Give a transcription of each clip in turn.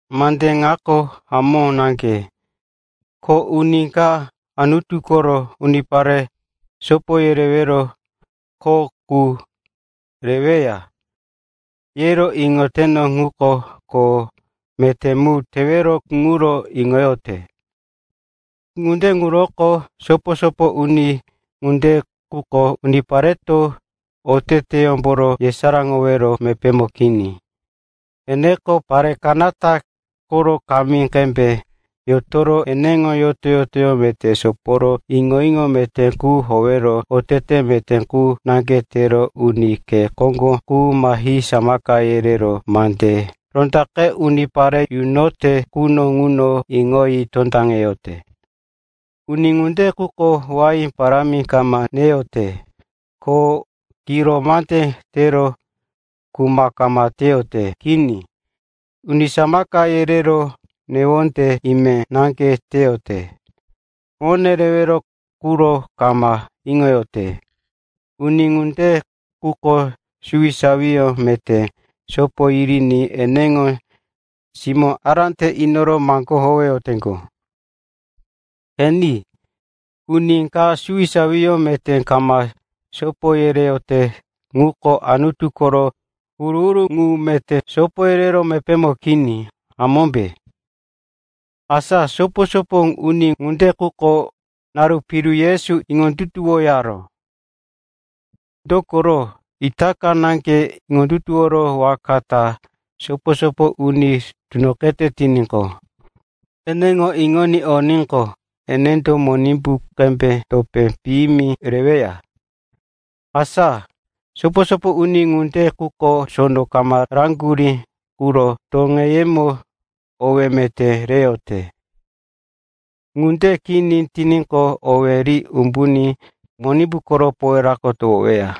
Mande ŋako hamó naŋge, ko uni ka, Anutu koro unipare sopo yerewero koro kho qu reweya, yero iŋote ŋuko kho meté mu tewero ŋuro iŋoyote. Ŋunde ŋuroko sopo-sopo uni ŋunde quko unipareto oteteyómboro yesaráŋowero mepémo kini. Eneko pare kanata koro kamí qembe yotoro eneŋo yoto-yotoyó meté soporo iŋo-iŋo meté qu howero otete meté qu naŋge tero uni khe koŋgo qu mahi samaka yerero mande rondaqe unipare yunote quno ŋuno iŋoyi tondaŋete. Uni ŋunde quko wain parámi kama neyote ko kiro mande tero kuma kama teyote. Kini, uni samaka yerero newonde ime naŋge teyote. Mone rewero quro kama iŋoyote. Uni ŋunde quko suwisawiyó meté sopo yiriní eneŋo simó ará te inoro maŋgó howeyoteŋgo. (Qeni, uni ka suwisawiyó meté kama sopo yereyote ŋuko Anutu koro huru-huru ŋu meté sopo yerewero mepémo kini, hamómbe?) Asa sopo-sopo uni ŋunde quko naru piru Yesu iŋondutuwoyaró. Dokoro itaka naŋge iŋondutuworo waka ta sopo-sopo uni tunoqete tiníqo, eneŋo iŋoní oníqo, enendo Monimbu qembe topé piyimi reweya. Asa sopo-sopo uni ŋunde quko sono kama raŋgurí ŋuro toŋeyemo owí meté reyote. Ŋunde kini tiníqo, owí ri umbuní Monimbu koro powerako towoweya.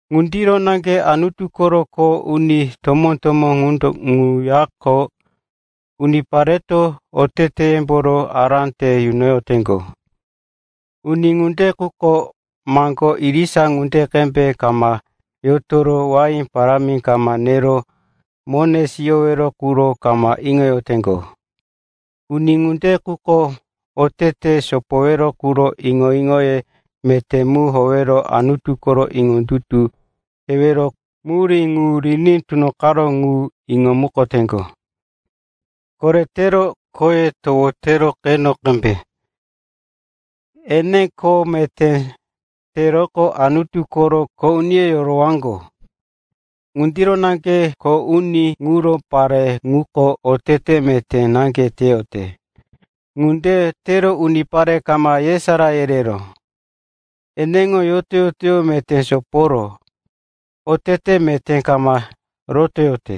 Ŋundiro naŋge Anutu koro kho uni tomó-tomó ŋuyako unipareto oteteyemboro ará te yunoyoteŋgo. Uni ŋunde quko maŋgo irisa ŋunde qembe kama yotoro wain parámi kama nero mone siyowero quro kama iŋoyoteŋgo. Uni ŋunde quko otete sopowero quro iŋo-iŋoye meté mu howero Anutuko iŋondutu tewero murí ŋu riní tunoqaró ŋu iŋomukoteŋgo. Koretero khoye towotero qeno qembe. Ene kho meté teroqo Anutu koro kho uniyó yorowaŋgo. Ŋundiro naŋge kho uni ŋuro pare qu ŋuko otete meté naŋge teyote. Ŋunde tero unipare kama yesará yerero, eneŋo yoto-yotoyó meté soporo, otete meté kama rotoyote.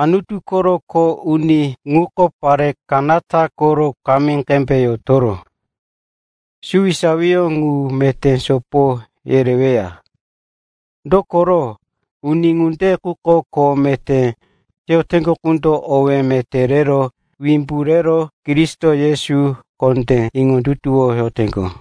Anutu koro kho uni ŋuko pare kanata koro kamí qembe yotoro, suwisawiyó ŋu meté sopo yereweya. Dokoro uni ŋunde ŋuko kho meté teyoteŋgo qundo owé meté rero wimbu rero Kristo Yesu kondé iŋondutuwoyoteŋgo.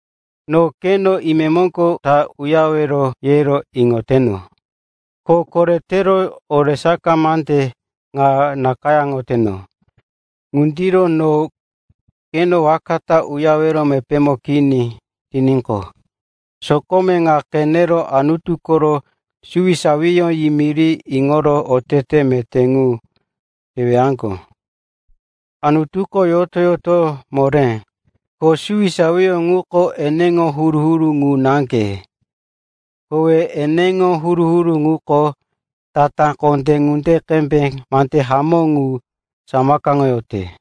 No keno imemoŋgo ta uyarewero, yero iŋoteno. Ko koretero oresaka mande ŋa nakayáŋoyoteno. Ŋundiro no keno waka ta uyarewero mepémo kini tiníqo, sokome ŋa qenero Anutu koro suwisawiyó yimiri iŋoro otete meté mu tewaŋgo. Anutuko yoto-yotoyó moré, ko suwisawiyó ŋuko eneŋo huru-huru ŋu naŋge. Kowe eneŋo huru-huru ŋuko tatá kondé ŋunde qembe mande hamó ŋu samakaŋoyote.